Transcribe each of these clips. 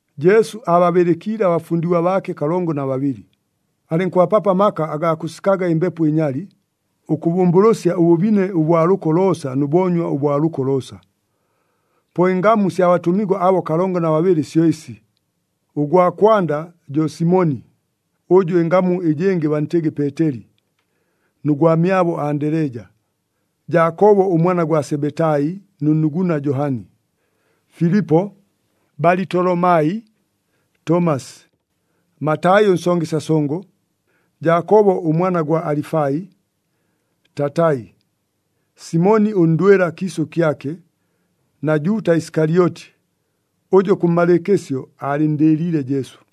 Jesu aababɨlɨkiile abafundigwa baake kalongo na babɨlɨ, alɨnkʉbapapo amaka agaa kʉsikaga ɨmbepo ɨnyali, ʉkʉbʉmbʉlʉsya ʉbʉbine ʉbwa lʉko loosa nʉ boonywa ʉbwa lʉko loosa. Po ɨngamu sya batʉmigwa abo kalongo na babɨlɨ syo ɨsi: Ʉgwa kwanda jo Simoni (ʉjʉ ɨngamu ɨjɨngɨ bantɨgɨ Peeteli) nʉ gwamyabo Andeleja, Jaakobo ʉmwana gwa Sebetai nʉ nnuguna Johani, Filipo, Balitolomai, Tomasi, Matai ʉnsongesya songo, Jaakobo ʉmwana gwa Alifai, Tatai, Simoni ʉndwɨla kiisʉ kyake, na Juuta Isikalyoti, ʉjʉ kʉmmalɨɨkɨsyo aalɨnndɨɨliile Jesu.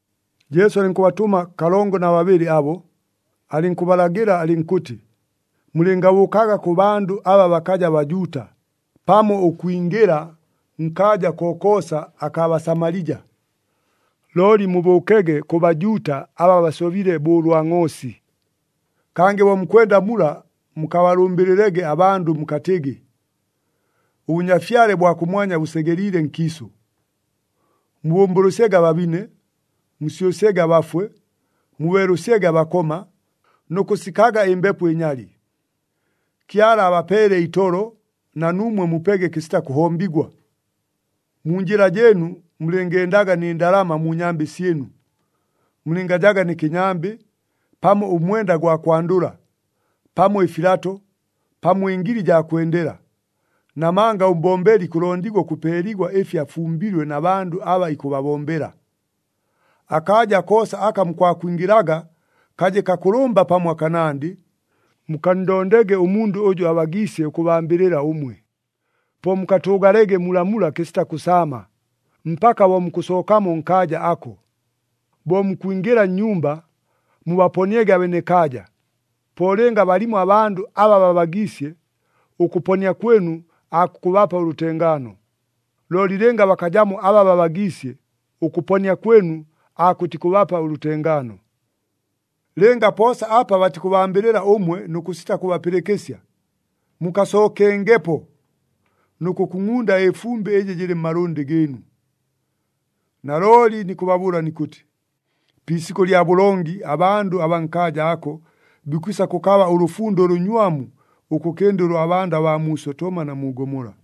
Jesu alɨnkʉbatʉma kalongo na babɨlɨ abo, alɨnkʉbalagɨla alɨnkʉtɨ, “Mulɨngabʉʉkaga kʉ bandʉ aba bakaja Bajuuta, pamo ʉkwingɨla nkaaja kokoosa akaa Basamalija. Looli mubʉʉkege kʉ Bajuuta aba basobile bo ʉlwa ngʼoosi. Kangɨ bo mukwenda mula mukabalʉmbɨlɨlege abandʉ mukatɨgɨ, ‘ɄBʉnyafyale bwa kʉmwanya bʉsegeliile nkiisʉ.’ Mubʉmbʉlʉsyege ababine, musyʉsyege abafwe, mubeelʉsyege abakoma, nʉ kʉsikaga ɨmbepo ɨnyali. Kyala abapeele itolo, na nuumwe mupege kɨsita kʉhombigwa. Mu njɨla jɨɨnu mulɨngendaga nɨ ndalama mu nyambɨ syɨnu. Mulɨngajaga nɨ kɨnyambɨ, pamo ʉmwenda gwa kwandʉla, pamo ɨfilato, pamo ɨngili jaa kwendela. Namanga ʉmbombeli ikʉlondigwa ʉkʉpeeligwa ɨfi afumbilwe na bandʉ aba ikʉbabombela. Akaaja koosa aka mukwakwingɨlaga kaje kakʉlʉmba pamo akanandɨ, mukanndondege ʉmundʉ ʉjʉ abagiisye ʉkʉbambɨlɨla ʉmwe. Po mukatʉʉgalege mulamula kɨsita kʉsaama, mpaka bo mukʉsookamo nkaaja ako. Bo mukwingɨla nnyumba, mubaponiege abenekaaja. Po lɨnga balimo abandʉ aba babagiisye, ʉkʉponia kwɨnu aakukʉbapa ʉlʉtengaano. Looli lɨnga bakajamo aba babagiisye, ʉkʉponia kwɨnu aakʉtikʉbapa ʉlʉtengaano. Lɨnga poosa apa batikʉbambɨlɨla ʉmwe nʉ kʉsita kʉbapɨlɨkɨsya, mukasookengepo nʉ kʉkungʼunda ɨfumbɨ ɨjɨ jɨlɨ mmalʉndɨ gɨɨnu. Nalooli nikʉbabʉʉla nikʉtɨ, pi isikʉ lya bʉlongi abandʉ abaa nkaaja ako, bikwisa kʉkaba ʉlʉfundo ʉlʉnywamu, ʉkʉkɨnda ʉlwa bandʉ baa mu Sotoma na mu Gomola!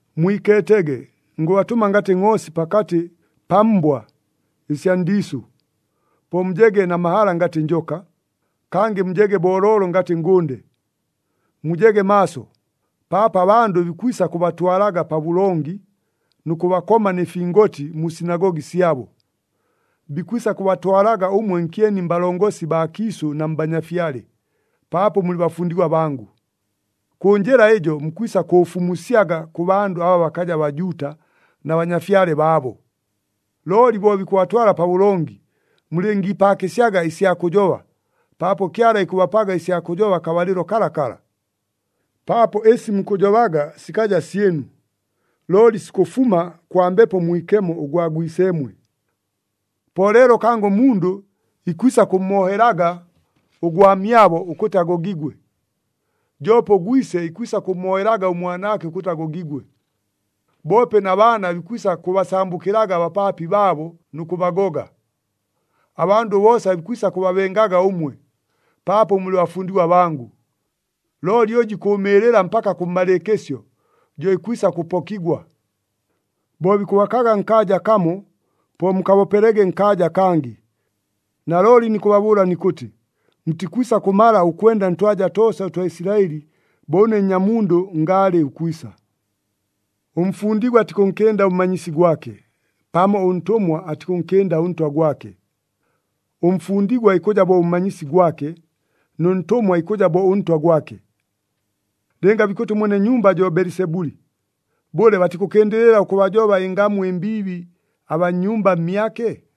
“Mwikeetege, ngʉbatʉma ngatɨ ngʼoosi pakatɨ pa mbwa ɨsya ndiisʉ. Po mujege na mahala ngatɨ njoka, kangɨ mujege booloolo ngatɨ ngʉnde. Mujege maaso, paapo abandʉ bikwisa kʉbatwalaga pabʉlongi, nʉ kʉbakoma nɨ fingoti mu sinagogi syabo. Bikwisa kʉbatwalaga ʉmwe nkyeni mbalongosi baa kiisʉ na mbanyafyale, paapo mulɨ bafundigwa bangʉ. Kʉ njɨla ɨjo mukwisa kʉʉfumusyaga kʉ bandʉ aba bakaja Bajuuta na banyafyale baabo. Looli bo bikʉbatwala pabʉlongi, mulɨngiipaakɨsyaga ɨsya kʉjoba, paapo Kyala ikʉbapaga ɨsya kʉjoba akabalɨlo kalakala. Paapo ɨsi mukʉjobaga sikaja syɨnu, looli sikʉfuma kwa Mbepo Mwikemo ʉgwa Gwiseemwe. Po leelo kangɨ ʉmundʉ ikwisa kʉmmoohelaga ʉgwamyabo ʉkʉtɨ agogigwe, joope ʉgwise ikwisa kʉmmoohelaga ʉmwanaake ʉkʉtɨ agogigwe. Boope na baana bikwisa kʉbasambʉkɨlaga abapaapi baabo nʉ kʉbagoga. Abandʉ boosa bikwisa kʉbabengaga ʉmwe, paapo mulɨ bafundigwa bangʉ. Looli ʉjʉ ikʉʉmɨɨlɨla mpaka kʉmmalɨɨkɨsyo, jo ikwisa kʉpokigwa. Bo bikʉbakaga nkaaja kamo, po mukabopelege nkaaja akangɨ. Nalooli nikʉbabʉʉla nikʉtɨ, mutikwisa kʉmala ʉkwenda ntwaja toosa ʉtwa Isilaɨli bo ʉne Nnyamundʉ ngaalɨ ʉkwisa. “Ʉmfundigwa atikʉnkɨnda ʉmmanyisi gwake, pamo ʉntʉmwa atikʉnkɨnda ʉntwa gwake. Ʉmfundigwa ikʉja bo ʉmmanyisi gwake, nʉ ntʉmwa ikʉja bo ʉntwa gwake. Lɨnga bikʉtɨ ʉmwene nyumba jo Belisebuli, bʉle, batikʉkɨndɨlɨla ʉkʉbajoba ɨngamu ɨmbiibi abaa nnyumba mmyake?”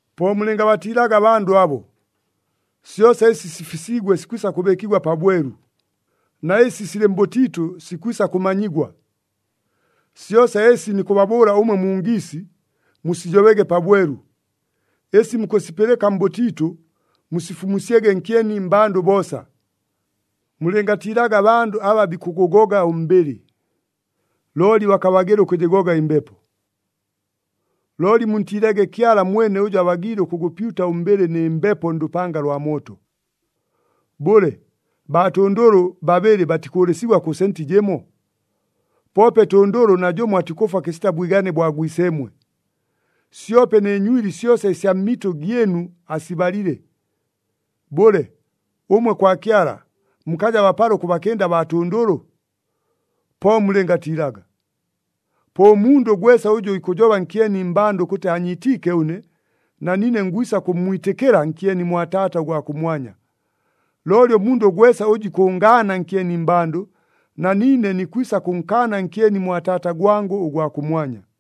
“Po mulɨngabatiilaga abandʉ abo. Syosa ɨsi sifisiigwe sikwisa kʉbɨɨkigwa pabwelu, na ɨsi silɨ mbʉtiitʉ sikwisa kʉmanyigwa. Syosa ɨsi nikʉbabʉʉla ʉmwe mu ngiisi, musijobege pabwelu. Ɨsi mukʉsipɨlɨka mbʉtiitʉ, musifumusyege nkyeni mmbandʉ boosa. Mulɨngatiilaga abandʉ aba bikʉgʉgoga ʉmbɨlɨ, looli bakabagɨla ʉkʉjɨgoga ɨmbepo. Looli muntiilege Kyala mwene ʉjʉ abagiile ʉkʉgʉpyuta ʉmbɨlɨ nɨ mbepo ndʉpanga lwa mooto. Bʉle, baatʉndʉlʉ babɨlɨ batikʉʉlɨsigwa kʉ senti jɨmo? Poope tʉndʉlʉ najʉmo atikʉfwa kɨsita bwigane bwa Gwiseemwe. Syope nɨ nywili syosa ɨsya mmitʉ gyɨnu asibalile. Bʉle, ʉmwe kwa Kyala, mukaja bapala ʉkʉbakɨnda baatʉndʉlʉ? Po mulɨngatiilaga! Po ʉmundʉ gwesa ʉjʉ ikʉjoba nkyeni mmbandʉ ʉkʉtɨ aanyiitiike ʉne, na niine ngwisa kʉmmwitɨkɨla nkyeni mwa Taata ʉgwa kʉmwanya. Looli ʉmundʉ gwesa ʉjʉ ikʉngaana nkyeni mmbandʉ, na niine nikwisa kʉnkaana nkyeni mwa Taata gwangʉ ʉgwa kʉmwanya.”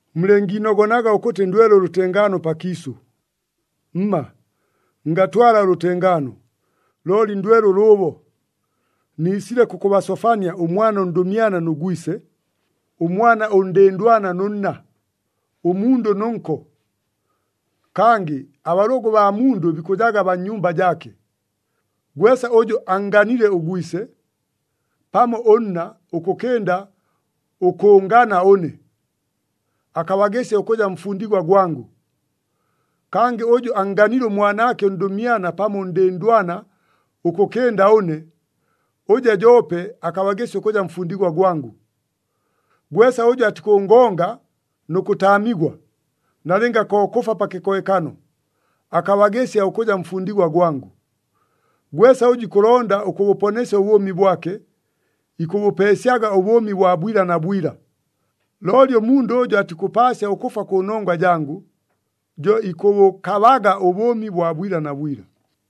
“Mulɨngiinogonaga ʉkʉtɨ ndwele ʉlʉtengaano pakiisʉ. Mma! Ngatwala ʉlʉtengaano, looli ndwele ʉlʉʉbo! Niisile kʉkʉbasofania ʉmwana ʉndʉmyana nʉ gwise, ʉmwana ʉndɨndwana nʉ nna, ʉmundʉ nʉ nko. Kangɨ abalʉgʉ baa mundʉ bikʉjaga baa nnyumba jaake. Gwesa ʉjʉ annganile ʉgwise pamo ʉnna ʉkʉkɨnda ʉkʉʉngana ʉne, akabagɨsya ʉkʉja mfundigwa gwangʉ. Kangɨ ʉjʉ annganile ʉmwanaake ʉndʉmyana pamo ʉndɨndwana ʉkʉkɨnda ʉne, ʉjo joope akabagɨsya ʉkʉja mfundigwa gwangʉ. Gwesa ʉjʉ atikʉngonga nʉ kʉtaamigwa, nalɨnga ko kʉfwa pa kɨkohekano, akabagɨsya ʉkʉja mfundigwa gwangʉ. Gwesa ʉjʉ ikʉlonda ʉkʉbʉponesya ʉbʉʉmi bwake, ikʉbʉpeesyaga ʉbʉʉmi bwa bwila na bwila. Looli ʉmundʉ ʉjʉ atikʉpaasya ʉkʉfwa kʉnongwa jangʉ, jo ikʉbʉkabaga ʉbʉʉmi bwa bwila na bwila.”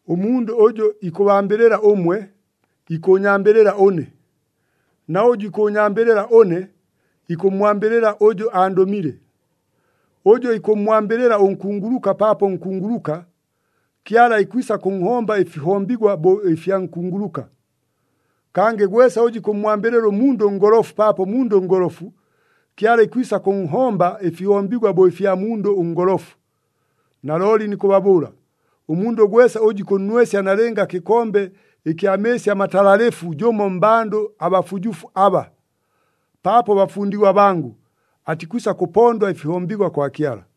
“Ʉmundʉ ʉjʉ ikʉbambɨlɨla ʉmwe, ikʉʉnyambɨlɨla ʉne. Na ʉjʉ ikʉʉnyambɨlɨla ʉne, ikʉmmwambɨlɨla ʉjʉ andʉmile. Ʉjʉ ikʉmmwambɨlɨla ʉnkunguluka paapo nkunguluka, Kyala ikwisa kʉnhomba ɨfihombigwa bo ɨfya nkunguluka. Kangɨ gwesa ʉjʉ ikʉmmwambɨlɨla ʉmundʉ ʉngolofu paapo mundʉ ngolofu, Kyala ikwisa kʉnhomba ɨfihombigwa bo ɨfya mundʉ ʉngolofu. Nalooli nikʉbabʉʉla, ʉmundʉ gwesa ʉjʉ ikʉnnwesya nalɨnga kɨkombe kya mɨɨsi amatalalɨfu jʉmo mmbandʉ abafujufu aba, paapo bafundigwa bangʉ, atikwisa kʉpondwa ɨfihombigwa kwa Kyala.”